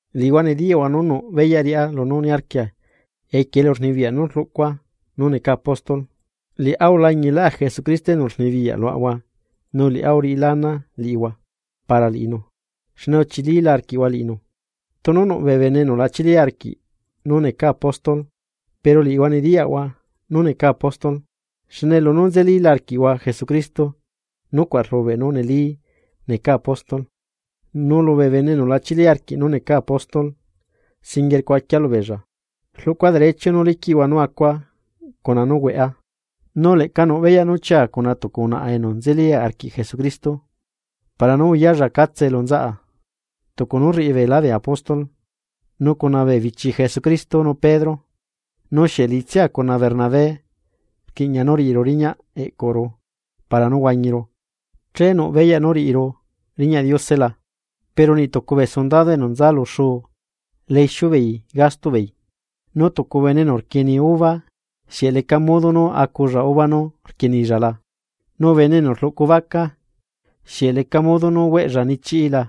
Liꞌihua nediyaꞌhua nú nuꞌ beyaꞌ riꞌá lunú niarquia equie elurnibiyaꞌ nú rluꞌcua nú necaa apóstol. Liꞌá ulañilá Jesucristo enu rnibiyaꞌ luaꞌahua nu liꞌá uriꞌilá ana liꞌihua para liꞌinu xne uchilila arquiꞌhua liꞌinu. Tunu nuꞌ bee bene enu la chili arquiꞌ nú necaa apóstol, pero liꞌihua nediyaꞌhua nú necaa apóstol, xne lunú nzelila arquiꞌhua Jesucristo nucuaꞌ rlubeꞌ nú neli necaa apóstol. Nu lubee bene enu lachili arquiꞌ nú necaa apóstol singuie rcuaquia lubeella: Rluꞌcua derecho nú liquiꞌhua nú acua cuna nú hueꞌa. Nu leꞌca nuꞌ beyaꞌ nú chiaa cuna tucu unaꞌa enu nzeli arquiꞌ Jesucristo para nú uyalla catse elu nzaꞌa, tucu nú rriꞌi beela bee apóstol nu cuna bee bichi Jesucristo nu Pedro. Nu ¿xieꞌ liꞌitsia cuna Bernabé rquiꞌña nú riꞌiru riñaꞌ eꞌcuru para nú huañiru, che nuꞌ beyaꞌ nú riꞌiru riñaꞌ Diose la? Pero niꞌtucu bee sundado enu nza lu xuu la ixiu beei gastoꞌ beei. Nu tucu bene enu rquieni uva, ¿xieꞌ leca modo nú aculla uva nú rquienilla la? Nu bene enu rluꞌcu vaca, ¿xieꞌ leca modo nú hueꞌlla nichiꞌí la?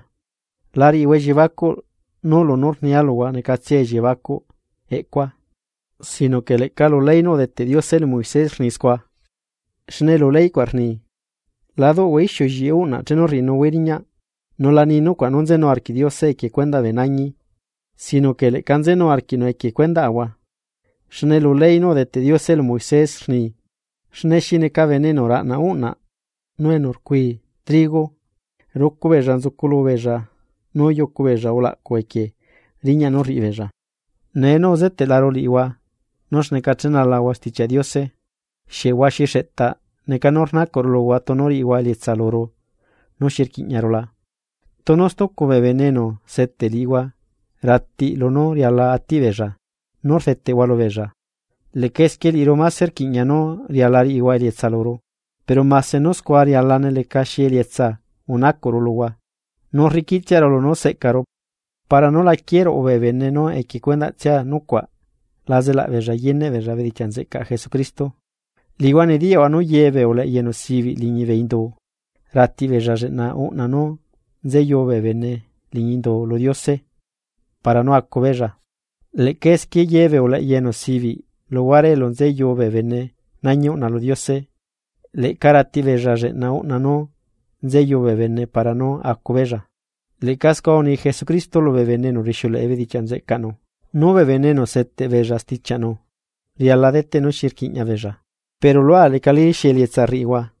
La riꞌihua elliebacuꞌ nú lunú rnia luhua necatsiae elliebacuꞌ eꞌcua, sino que leꞌca lu ley nú udeteꞌ Diose lu Moisés rni scua. Xne lu ley cuaꞌ rni: “La duꞌhua ixiu lliꞌi uꞌnaꞌ chenu rriꞌinuhuaí riñaꞌ.” Nu la ni nucuaꞌ nú nzenu arquiꞌ Diose equie cuendaꞌ bee nañi, sino que leꞌca nzenu arquiꞌnu equie cuendaꞌahua. Xne lu ley nú udeteꞌ Diose lu Moisés rni: Xne xi neca bene enu raꞌna uꞌna nu enu rcui trigo, rucu beella nzuculu beella nú yucu beella ulaꞌcu equie riñaꞌ nú rriꞌibeella. Nee nú uzeteꞌlaru liꞌihua nú xneca chenalahua Stichiaꞌ Diose, ¿xieꞌ huaxi xeꞌtaꞌ neca nú rnacuꞌru luhua tunu riꞌihua elietsa luru nú xi rquiꞌñaru la? Tunu stucu bee bene enu seteꞌ liꞌihua ratiꞌ lunú riala atiꞌ beella nú rdeteꞌhua lubeella, leꞌca esquie liꞌiru máse rquiꞌña nú riala riꞌihua elietsa luru, pero mase nú scua rialane lecaxi elietsa unacuꞌru luhua, nu rriquiꞌtsiaru lunú seꞌcaru para nú la quieruꞌu bee bene nú equie cuendaꞌtsiaꞌ nucuaꞌ la zelabeella yeneꞌ beella bedichiaꞌ nzeꞌcaꞌ Jesucristo. Liꞌihua nediyaꞌhua nú ye bee uleꞌya enu sibiꞌ liñi bee indu, ratiꞌ beella lleꞌna uꞌna nú nzeyu bee bene liñi indu lu Diose para nú acubeella. Leꞌca esquie yebee uleꞌya enu sibiꞌ luhuare elu nzeyu bee bene nañi uꞌna lu Diose, leꞌca ratiꞌbeella lleꞌna uꞌna nú nzeyu bee bene para nú acu beella. Leꞌca scua uni Jesucristo lubee bene enu rixiuleꞌe bedichiaꞌ nzeꞌcaꞌnu, nú bee bene enu seteꞌ beella stichiaꞌnu, riala deteꞌ nú xi rquiꞌña beella, pero lua lecali xi elietsa rriꞌihua,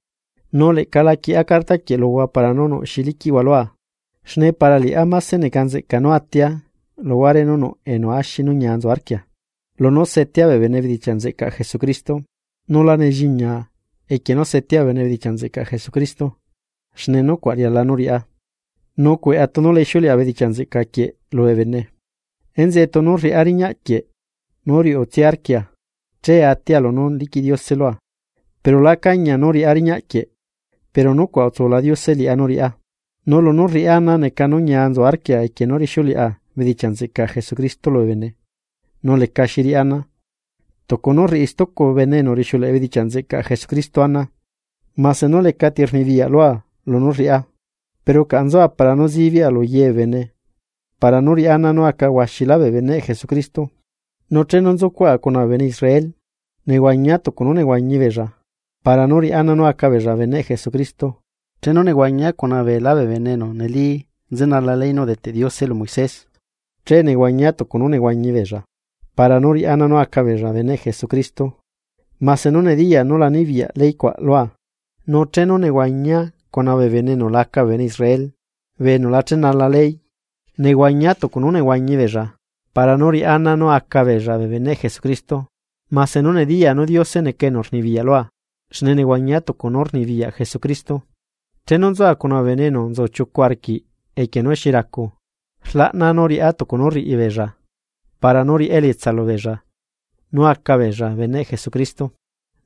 nu leꞌca la quieꞌa cartaquieꞌ luhua para nú xi liquiꞌhua lua. Xne para liꞌá máse neca nzeꞌca nú atia luhuare nú nuꞌ enu axi nú ñia nzu arquia, lunú setea bee bene bedichiaꞌ nzeꞌcaꞌ Jesucristo. Nu la nelliñiaa equie nú setea bee bene bedichiaꞌ nzeꞌcaꞌ Jesucristo, xne nucuaꞌ riala nú riꞌá. Nu cueꞌa tunu la ixiuleꞌa bedichiaꞌ nzeꞌca quieꞌ lubee bene. Enzeꞌe tunu rriꞌá riñaꞌ quieꞌ nú riuꞌtsia arquia che atia lunú liquiꞌ Diose lua, pero lá cañia nú riꞌá riñaꞌ quieꞌ pero nucuaꞌ utsula Diose liꞌá nú riꞌá. Nu lunú rriꞌá ana neca nú ñia nzu arquia equie nú rixiuleꞌa bedichiaꞌ nzeꞌcaꞌ Jesucristo lubee bene, nu lecaxi riꞌá ana, tucu nú rriꞌi stucu bene enu rixiuleꞌe bedichiaꞌ nzeꞌcaꞌ Jesucristo ana. Mase nú lecati rnibiyaꞌ lua lunú rriꞌá, pero caꞌa nzua para nú sibiꞌa lu ye bee bene para nú riꞌá ana nú aca huaxila bee beneꞌ Jesucristo. Nu chenu nzucuaꞌa cuna bee bene Israel, nehuañia tucu nú nehuañi beella para nú riꞌá ana nú aca beella beneꞌ Jesucristo. Chenu nehuañia cuna beelá bee bene enu neli nzenala ley nú udeteꞌ Diose lu Moisés. Che nehuañia tucu nú nehuañi beella, para nú riꞌá ana nú aca beella beneꞌ Jesucristo, mase nú nediya nu la nibiyaꞌ ley cuaꞌ lua. Nu chenu nzucuaꞌa cuna bee bene enu laca bee bene Israel, bee enu la chenala ley, nehuañia tucu nú nehuañi beella para nú riꞌá ana nú aca beella bee beneꞌ Jesucristo, mase nú nediya nú Diose neca enu rnibiyaꞌ lua xne nehuañia tucu nú rnibiyaꞌ Jesucristo. Chenu nzua cuna bee bene enu nzu chiucu arquiꞌ equie nú xi racu, rlaꞌnaa nú rriꞌá tucu nú rriꞌi beella para nú riꞌá elietsa lubeella nú acabeella beneꞌ Jesucristo.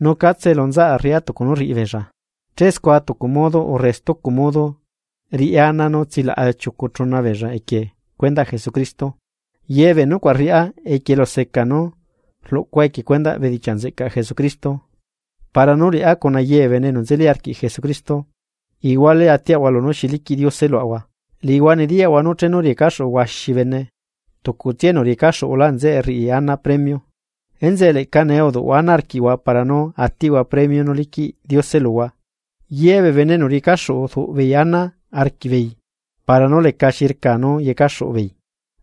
Nu catse elu nzaꞌa rriꞌá tucu nú rriꞌi beella, che scua tucu modo urre stucu modo riꞌá ana nú tsilaꞌa chiucu chuna beella equie cuendaꞌ Jesucristo. Ye bee nucuaꞌ rriꞌá equie eluseca nú rluꞌcua equie cuendaꞌ bedichiaꞌ nzeꞌcaꞌ Jesucristo, para nú liꞌá cuna ye bee bene enu nzeli arquiꞌ Jesucristo, iguale atiaꞌahua lunú xi liquiꞌ Diose luaꞌahua. Liꞌihua nediyaꞌhua nú chenu riecaxuꞌu huaxi bene, tucutsia enu riecaxuꞌulá nzeꞌe rriꞌi ana premio. Enzeꞌe leꞌca nee uduꞌhua ana arquiꞌhua para nú atiꞌhua premio nú liquiꞌ Diose luhua. Ye bee bene enu riecaxuꞌu rduꞌ beei ana arquiꞌbeei para nú lecaxi rcaa nú yecaxuꞌu beei,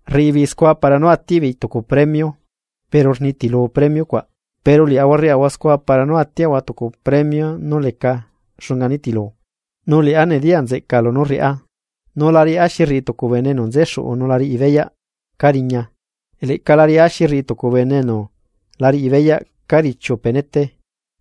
rriꞌi beei scua para nú atiꞌ beei tucu premio, pero rnitilu premio cuaꞌ, pero liaꞌahua rriaꞌahua scua para nú atiaꞌahua tucu premio nú leca xunga nitilu. Nu liꞌá nediya nzeꞌcaa lunú rriꞌá, nu la riꞌá xi rriꞌi tucu bene enu nzexuꞌu nu la riꞌi beyaꞌ cariña. Leꞌca la riꞌá xi rriꞌi tucu bene enu la riꞌi beyaꞌ ca richiu penete.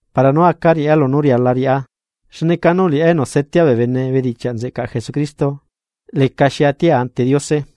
Para nú aca riꞌá lunú riala riꞌá xne canu liꞌá enu setea bee bene bedichiaꞌ nzeꞌcaꞌ Jesucristo lecaxi atia ante Diose.